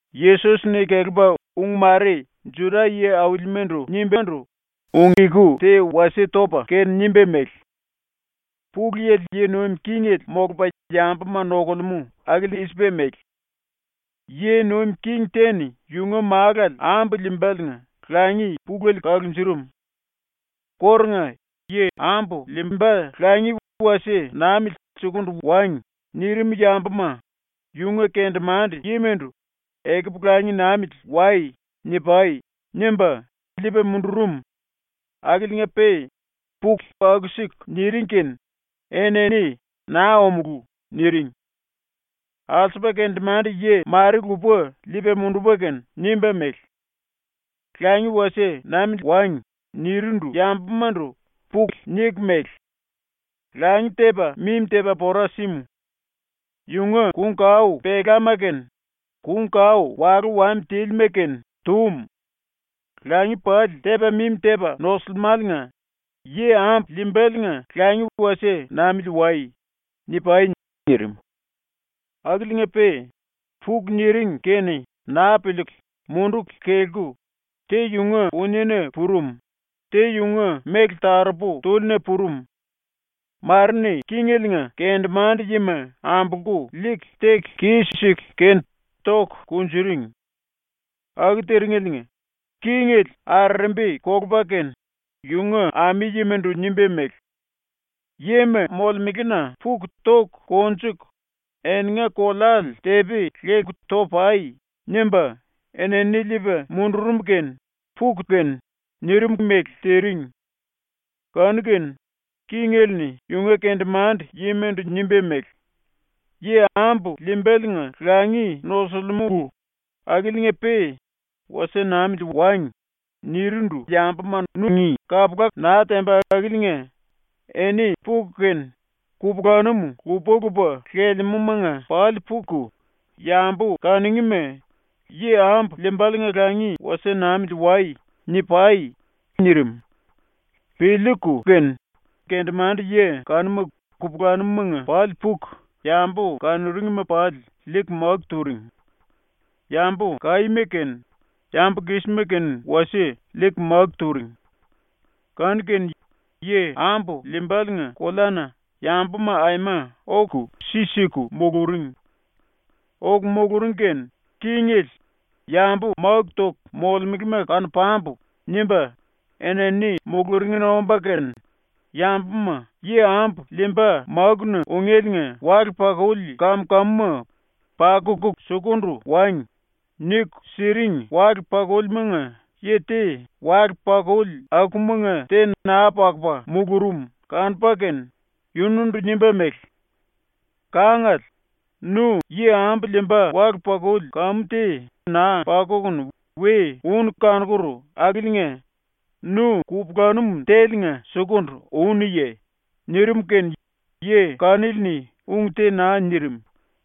Yesos-ni kelepa ung mare ⸤Juda yi-aulimandu nimbándu⸥ ung-eku te wasie topa kene nimba mele: “Pulu Yili yi nuim kingele molupa yambuma nokulemú akili i-sipa mele: “Yi nuim king te-ni yunga málale ambu liimbaliinga langi pulele kalunjurum. Kórunga “Yi ambu liimba langi wasie namili sukundu wangi.” nirim yambuma yunga kendemande-yimandu “ “Ekupu langi namili wai.” ni-pai.” nimba liipa mundurum, akiliinga-pe puku aku-siku niring kene enini “Naa omulú.” niring. Alsupa kendemande-yi mare lupa liipa mundupa kene nimba mele: “ “Langi wasie namili wangi.” nirindu yambumandu puku niku mele: “Langi tepa mimi tepa pora símu. Yunga kung-kao pelama kene kung-kao walú wami tílima kene tum. Langi pali tepa mimi tepa nosilimáliinga yi ambu liimbaliinga langi wasie namili wai.” ni-pai.” nirim. Akiliinga-pe puku niring kene naa piliiku munduku kelku, te yunga puniena purum, te yunga méle taropu túlina purum, mare-ni kingeliinga kendemande-yima ambolku liiku teku kis-siku kene toku kunjuring. ⸤Aku tiringeliinga⸥ kingele arerembi kolupa kene yunga ami-yimandu nimba mele: “Yima molemelena puku toku konjuku eninga koleale tepi leku to-pai.” nimba enini liipa mundurum kene puku kene, nirim mele tiring. Kanu-kene kingele-ni yunga kendemande-yimandu nimba mele: “Yi ambu liimbaliinga langi nosuliumulu akiliinga-pe “Wasie namili wangi.” nirindu yambuma nungí kapula naa temba akiliinga eni puku kene kupulanum lupa-lupa lelemúmanga pali puku yambu kanungíma “Yi ambu liimbaliinga langi wasie namili wai.” ni-pai.” nirim. Piliiku kene kendemande-yi kanuma kupulanumumanga pali puku yambu kanuringma pali liiku máku turing. Yambu kaíma kene yambu kísima kene wasie liiku máku turing. Kanu-kene yi ambu liimbaliinga koleana yambuma aima oku si siku muluring. Oku muluring kene kingele “Yambu máku toku molemelema kanu-pambu.” nimba enini muluringna omba kene, yambuma yi ambu liimba ⸤mákuna ungéliinga wale-pakuli kam-kamuma ‘pakuku sukundu wangi.’ niku siring⸥ wale-pakulimanga yi te wale-pakuli akumanga te naa pakupa mulurum kanupa kene yunundu nimba mele: “Kangale, nu yi ambu liimba wale-pakuli kamu te naa pakukunu we únu kanokur akiliinga nu kupulanum téliinga sukundu únuye?” nirim kene yi kanili-ni ung te naa nirim.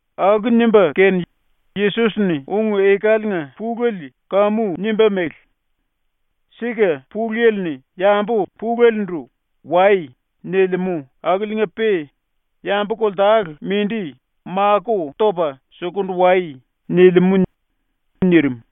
⸤Aku nimba kene Yesos-ni ung-ekaliinga pulele kamu nimba mele:⸥ “Sika ⸤Pulu Yili-ni⸥ yambu pulelendu “Wai.” nilimú akiliinga-pe yambu koltale mindi makó topa “Sukundu wai.” nilimú.” nirim.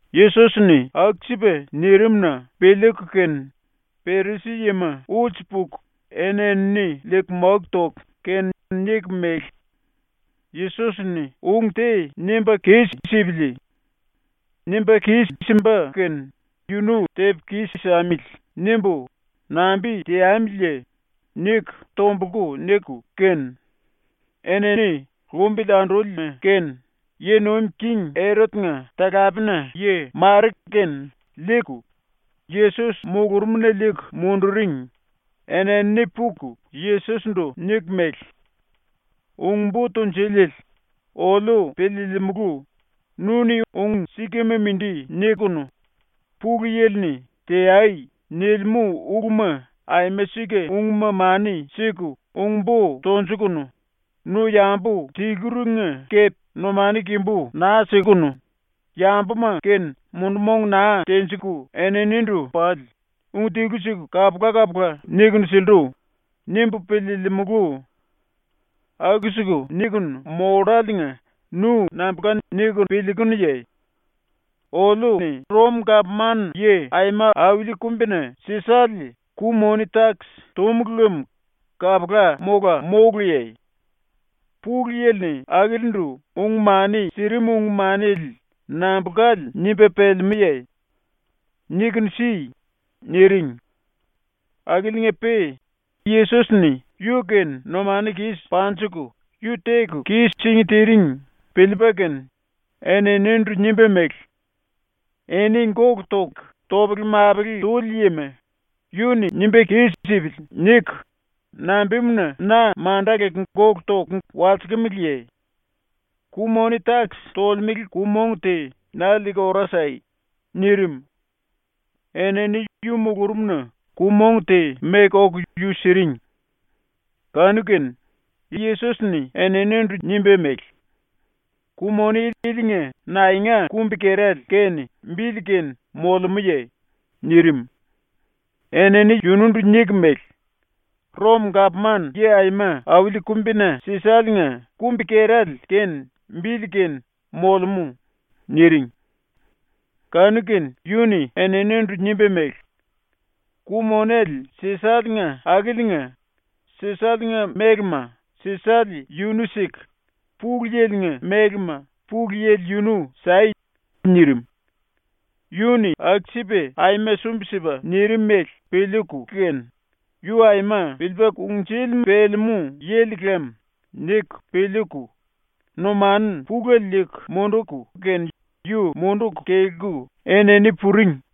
⸤Yesos-ni aku-sipa nirim⸥-na ⸤piliiku kene⸥ Perisi-yima ulsu puku eni-enini liiku máku toku kene niku mele: “‘Yesos-ni ung te nimba kis-sipili. Nimba kis-simba kene yunu tepu kis-samili.’ nimbu nambi teamiliye?” niku tombulku niku kene, enini lumbili andúlima kene yi nuim king Erot-nga talapena-yi mare kene liiku Yesos mulurumna liiku munduring, enini puku Yesos-ndu niku mele: “Ung-Bo Tunjuliele, oliu piliilimulu, ‘Nu-ni ung-sikama mindi niku, Pulu Yili-ni “Teai.” nilimú uluma aima sika-ungma mani siku ung-bo tonjukunu, nu yambu tiluringa kepe numanu kimbu naa sikunu, yambuma-kene mundu-mong naa tenjiku eninindu pali ung tilu-siku kapula-kapula nikunu sillu.’ nimbu piliilimulu. Aku-siku nikunu molláliinga nu nambulka niku piliikunuye? Oliu-ni Rom-Gapman-Yi Aima Auli Kumbina Sisale ku-moni-takis túmulu lem kapula mola móluye? Pulu Yili-ni akilindu ung-mani sirim ung-manele nambulkale nimba pelemúye? Nikunu si.” niring. Akiliinga-pe Yesos-ni yu-kene numanu kis panjiku yu teku kis-singí tiring piliipa kene eninindu nimba mele: “Eni gólu toku topele-mapele tuli yima, ‘Yu-ni nimba kis-sipili.’ niku nambimuna na manda leku gólu toku walsikimiliye? Ku-moni-takis tolemele ku-mong te na liiku ora sai.” nirim. Enini yu mulurumna ku-mong te meku oku yu siring. Kanu-kene Yesos-ni eninindu nimba mele: “Ku-moni ilinga naenga kumbi-kerale kene bili kene molemúye?” nirim. Enini yunundu niku mele: “Rom-Gapman-Yi Aima Auli Kumbina Sisale-nga kumbi-kerale kene bili kene molemú.” niring. Kanu-kene yu-ni eninindu nimba mele: “⸤Ku-monele Sisale-nga⸥ akiliinga Sisale-nga mélema Sisale yunu siku, Pulu Yili-nga mélema Pulu Yili yunu sai.” nirim. Yu-ni aku-sipa ⸤aima sumbi-sipa⸥ nirim mele piliiku kene ⸤‘Yu aima piliipa kungnjuli pelemú yili lam.’ niku piliiku⸥ numanu pulele liiku munduku kene yu munduku kelku enini puring.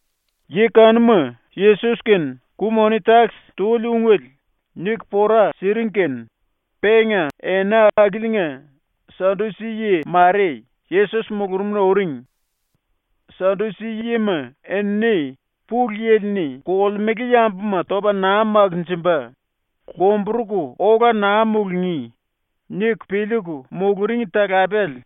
⸤Yi kanuma Yesos kene ku-moni-takis tuli ungele niku pora siring kene⸥ penga ena akiliinga Sadusi-yi mare Yesos mulurumna uring. Sadusi-yima enini ‘Pulu Yili-ni kolemele yambuma topa naa makinjimba, lomburuku ola naa mulungí.’ niku piliiku muluring talapele.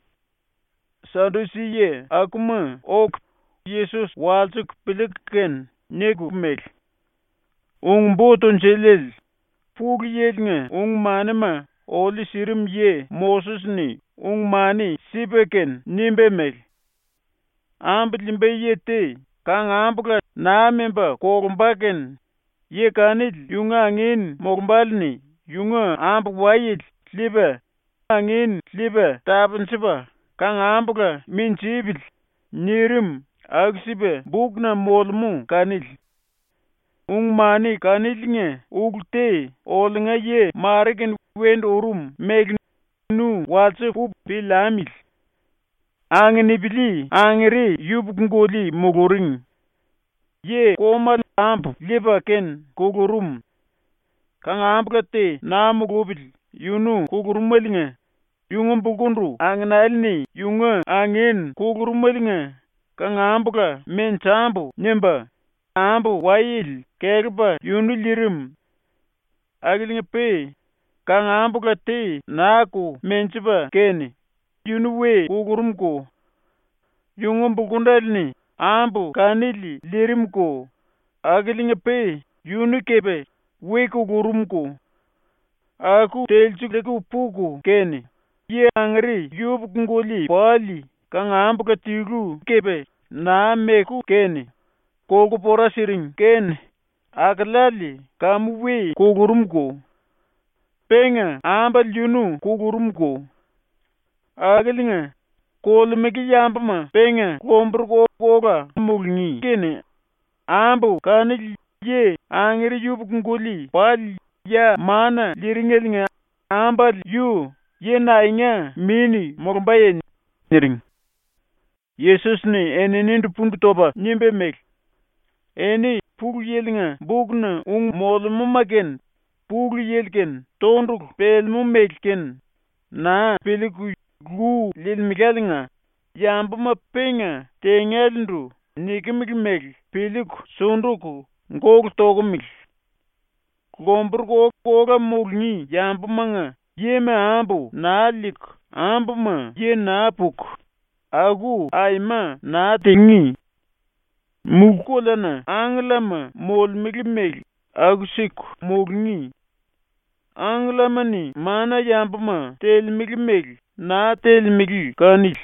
Sadusi-yi akuma oku Yesos walsiku piliiku kene niku mele: “Ung-Bo Tunjuliele, ⸤Pulu Yili-nga ung-manima oliu sirim yi⸥ Moses-ni ung-mani sipa kene nimba mele: “Ambu liimba yi te kangambula naa memba kolumba kene yi kanili yunga angin molumbále-ni yunga ambu-wayele liipa angin liipa tapunjupa kangambula minjipili.” nirim aku-sipa bukna molemú kanili. ⸤Ung-mani kaniliinga ulu te oliunga yi mare-kene wendu urum mele nu walsipu piliamili.⸥ “Anginipili angere yupuku-guli muluring. Yi-komale ambu liipa kene kulurum. Kangambula te naa mulupili yunu kulurumeliinga yunga bulkundu anginele-ni ⸤yunga angin kulurumeliinga⸥ kangambula ‘menjambu.’ nimba ambu-wayele kelepa yunu liirim. Akiliinga-pe kangambula te naa-ko menjipa kene yunu we kulurumko. Yunga bulkundele-ni ambu kanili liirimko akiliinga-pe yunu kepe we kulurumko. Aku telsiliiku puku kene yi angere yupuku-guli pali kangambula tilu kepe naa meku kene kolku pora siring kene akeleale kamu we kulurumko. Penga ambale yunu kulurumko. Akiliinga, kolemele yambuma penga lomburuku ola mulungí kene ambu kanili yi angere yupuku-guli pali ya mana liiringeliinga ambale yu yi naenga min molumbaye?” niring. Yesos-ni eninindu pundu topa nimba mele: “Eni Pulu Yili-nga bukna ung molemúma kene, Pulu Yili-kene tondulu pelemú mele kene, naa piliiku lu liilimeláliinga ⸤yambuma penga tengélendu nikimili mele piliiku sunduku gólu tokomele⸥. Lomburuku ola mulungí yambumanga yima ambu naa liiku, ambuma yi naa puku, aku aima naa tingí. Mulú-koleana angkellama molemele mele aku-siku mulungí. ⸤Angkellama-ni mana-yambuma telemele mele naa telemele kanili.⸥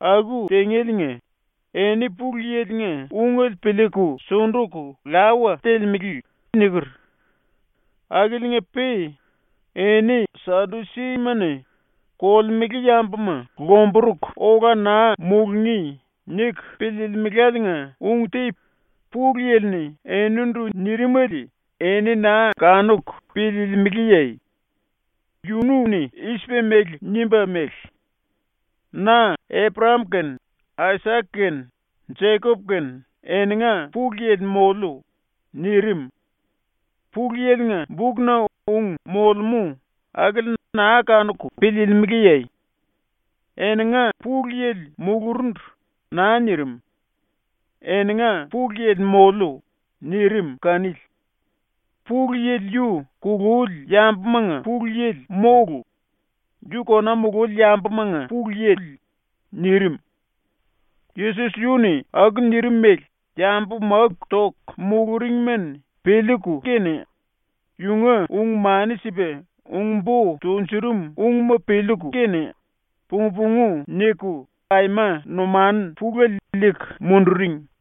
Aku tingéliinga ⸤‘Eni Pulu Yili-nga ungele piliiku sunduku lawa telemele.’ niker.⸥ “Akiliinga-pe ⸤eni Sadusima-ni⸥ ‘Kolemele yambuma lomburuku ola naa mulungí.’ niku piliilimeláliinga ung te Pulu Yili-ni enindu nirimele eni naa kanuku piliilimiliye? Yunu-ni i-sipa mele nimba mele: “Na Eprayam kene Aisak kene Jekop kene eninga Pulu Yili moliu.” nirim. Pulu Yili-nga bukna ung molemú akili naa kanuku piliilimiliye? ⸤‘Eninga Pulu Yili mulurundu.’ naa nirim. ‘Eninga Pulu Yili moliu.’ nirim kanili.⸥ Pulu Yili yu kululi yambumanga Pulu Yili mólu; yu kona mululi yambumanga Pulu Yili.” nirim. Yesos yu-ni aku nirim mele yambu máku toku muluringma-ni piliiku kene yunga ung-mani sipa ung-bo tunjurum ungma piliiku kene pung-pungu niku aima numanu pulele liiku munduring.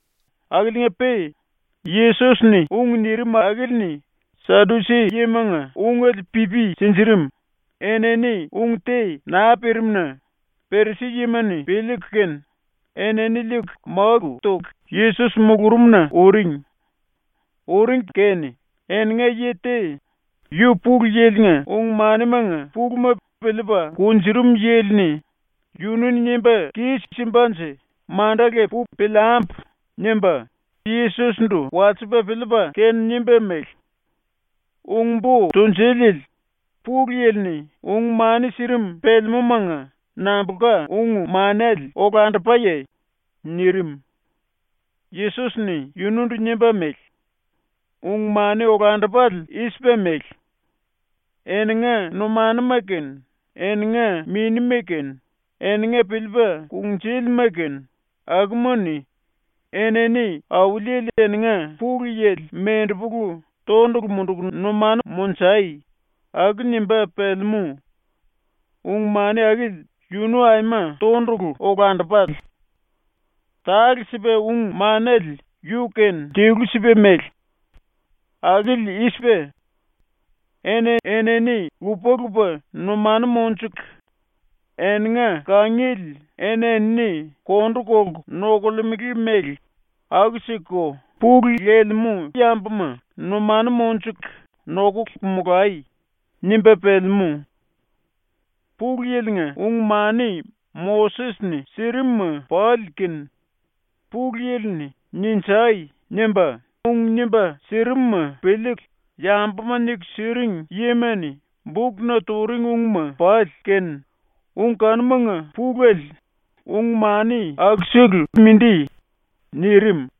Akiliinga-pe Yesos-ni ung nirim akili-ni Sadusi-yimanga ungele pipi sinjirim, enini ung te naa pirim-na Perisi-yima-ni piliiku kene enini liiku máku toku ⸤Yesos mulurumna⸥ uring. ⸤Uring kene⸥ eninga yi te, yu Pulu Yili-nga ung-manimanga puluma piliipa kunjurum yili-ni ‘Yunu-ni nimba kis-simbanje manda lepu piliambu.’ nimba Yesos-ndu walsipa piliipa kene nimba mele: “Ung-Bo Tunjuliele, Pulu Yili-ni ung-mani sirim pelemúmanga nambulka ung-manele olandupaye?” nirim. Yesos-ni yunundu nimba mele: “Ung-mani olandupale i-sipa mele: ‘Eninga numanuma kene, eninga minima kene, eninga piliipa kungnjúlima kene, akuma-ni Auliele eninga Pulu Yili mendepulu tondulu munduku numanu monjai.’ aku nimba pelemú. Ung-mani akili yunu aima tondulu, olandupale. Tale-sipa ung-manele yu-kene tilu-sipa mele. Akili i-sipa: ‘Eni-enini lupa-lupa numanu monjuku eninga kangiele eni-enini kondu kolku nokolemele mele aku-sikuko pulu lelemú yambuma numanu monjuku nokuku molai.’ nimba pelemú. Pulu Yili-nga ung-mani Moses-ni sirim-ma pali kene, Pulu Yili-ni “Ninjai!” nimba ung nimba sirimuma piliiku yambuma niku siring yima-ni bukna turing ungma pali kene, ung kanumanga pulele ung-mani akusele mindi.” nirim.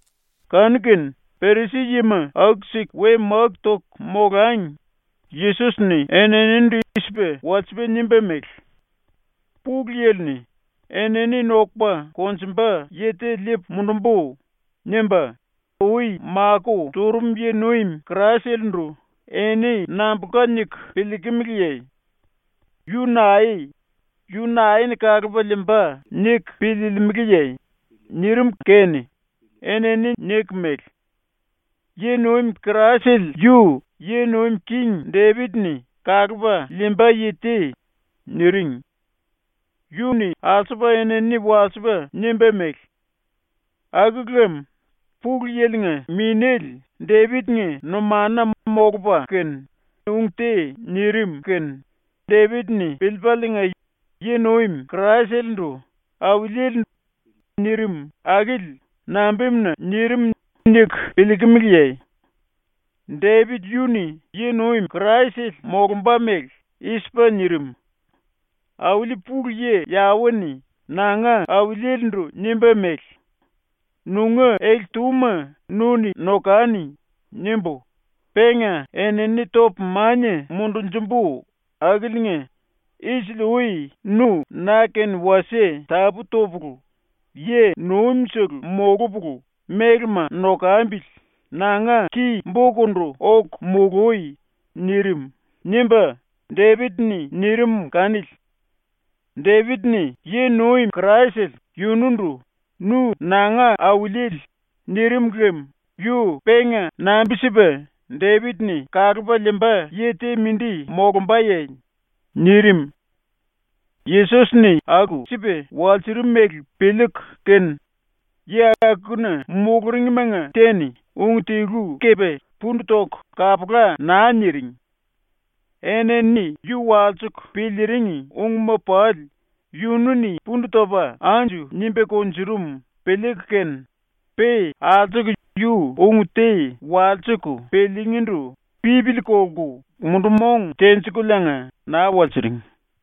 Kanu-kene Perisi-yima aku-siku we máku toku molangi Yesos-ni eninindu i-sipa walsipa nimba mele: “Pulu Yili-ni “Enini nokupa konjumba yi te liipu mundumbu.” nimba ui makó turum yi-nuim Kraisele-ndu eni nambulka niku piliikimiliye? Yu nae? Yu nae-ni kalupa liimba niku piliilimiliye?” nirim kene enini niku mele: “⸤Yi-nuim Kraisele yu yi nuim king⸥ Depit-ni kalupa liimba yi te.” niring. Yu-ni alsupa enini walsipa nimba mele: “Aku lem ⸤Pulu Yili-nga⸥ Minéle Depit-nga numanuna molupa kene ung te nirim kene Depit-ni piliipaliinga yi-nuim Kraisele-ndu “Auliele” nirim akili nambimuna nirim niku piliikimiliye? Depit yu-ni ⸤yi-nuim Kraisele molumba mele⸥ i-sipa nirim: “Auli ⸤Pulu Yi Yawe-ni⸥ nanga Auliele-ndu nimba mele: “‘Nunga ele-túma nu-ni nokani.’ nimbu, penga enini topu mania mundunjumbu akiliinga isili-ui nu ⸤na-kene wasie tapú topulu yi-nuimsele molupulu mélema nokambili⸥ nanga ki-bokundu oku mului.” nirim.” nimba Depit-ni nirim kanili. Depit-ni ⸤yi-nuim Kraisele⸥ yunundu “Nu nanga Auliele.” nirim lem yu penga nambi-sipa Depit-ni kalupa liimba yi te ⸤mindi⸥ molumbaye?” nirim. ⸤Yesos-ni aku-sipa walsurum mele piliiku kene⸥ yi akuna muluringmanga te-ni ung tilu kepe pundu toku kapula naa niring. ⸤Enini yu walsiku piliiring ungma pali yunu-ni pundu topa anju nimba kunjurum piliiku kene⸥ pe alsuku yu ung te walsiku piliingíndu pipili kolku mundu-mong tenjikuliinga naa walsiring.